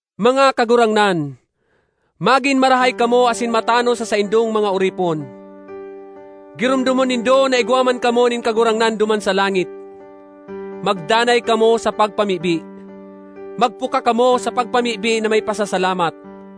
Mga kagurangnan, magin marahay kamo asin matanos sa saindong mga oripon. Giromdomon nindo na igwa man kamo nin Kagurangnan duman sa langit. Magdanay kamo sa pagpamibi. Magpuka kamo sa pagpamibi na may pasasalamat.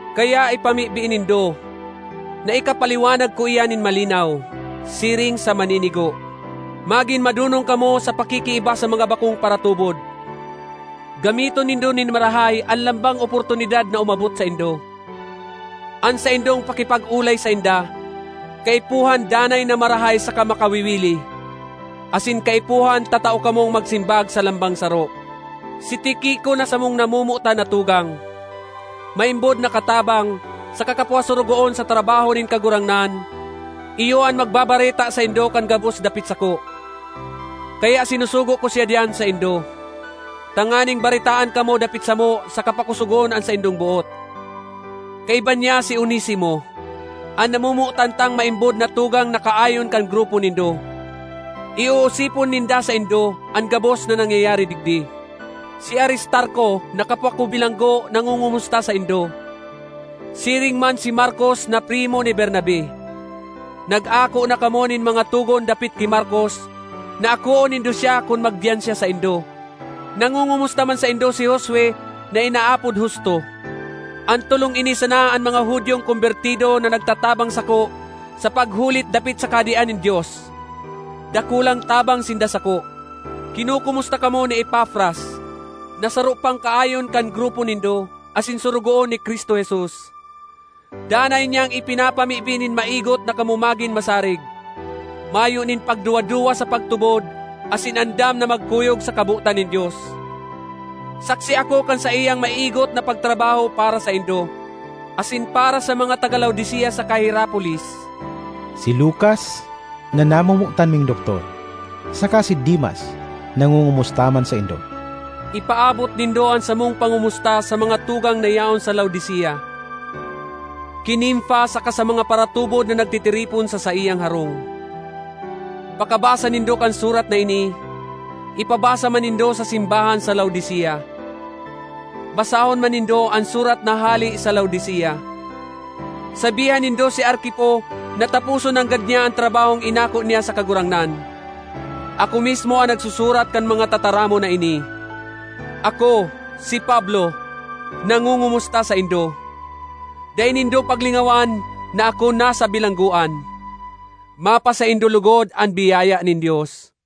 Kaya ipamibi nindo na ikapaliwanag ko iyan nin malinaw, siring sa maninigo. Magin madonong kamo sa pakikiiba sa mga bakong paratubod. Gamiton nindo nin marahay an lambang oportunidad na umabot saindo. An saindong pakipag-olay sainda, kaipuhan danay na marahay saka makawiwili, asin kaipuhan tatao kamong magsimbag sa lambang saro. Si Tiquico na samong namomotan na tugang, maimbod na katabang, saka kapwa sorogoon sa trabaho nin Kagurangnan, iyo an magbabareta saindo kan gabos dapit sako. Kaya sinusugo ko siya diyan saindo, tanganing baretaan kamo dapit samo saka pakosogon an saindong boot. Kaiba niya si Onesimo, an namomotan tang maimbod na tugang na kaayon kan grupo nindo. Ioosipon ninda saindo an gabos na nangyayari digdi. Si Aristarco na kapwa ko bilanggo nangongomusta saindo; siring man si Markos na primo ni Bernabe. (Nag-ako na kamo nin mga togon dapit ki Markos, na akoon nindo siya kun magdiyan siya saindo.) Nangongomusta man saindo si Josue na inaapod Justo. An tolong ini sana an mga Judiong kombertido na nagtatabang sako sa paghulit dapit sa Kahadean nin Dios; dakulang tabang sinda sako. Kinokomusta kamo ni Epafras, na saro pang kaayon kan grupo nindo, asin sorogoon ni Cristo Jesus. Danay niyang ipinapamibi nin maigot na kamo magin masarig, mayo nin pagduwa-duwa sa pagtubod asin andam na magkuyog sa kabotan nin Dios. Saksi ako kan saiyang maigot na pagtrabaho para saindo, asin para sa mga taga Laodicea saka Hierapolis. Si Lukas, na namomotan ming doktor, saka si Demas nangongomusta man saindo. Ipaabot nindo an samong pangomusta sa mga tugang na yaon sa Laodicea; ki Nimfa saka sa mga paratubod na nagtitiripon sa saiyang harong. Pakabasa nindo kan surat na ini, ipabasa man nindo sa simbahan sa Laodicea. Basahon man nindo an surat na hale sa Laodicea. Sabihan nindo si Arquipo na taposon nanggad niya an trabahong inako niya sa Kagurangnan. Ako mismo an nagsusurat kan mga tataramon na ini: Ako, si Pablo, nangongomusta saindo. Dai nindo paglingawan na ako nasa bilanggoan! Mapasaindo logod an biyaya nin Dios.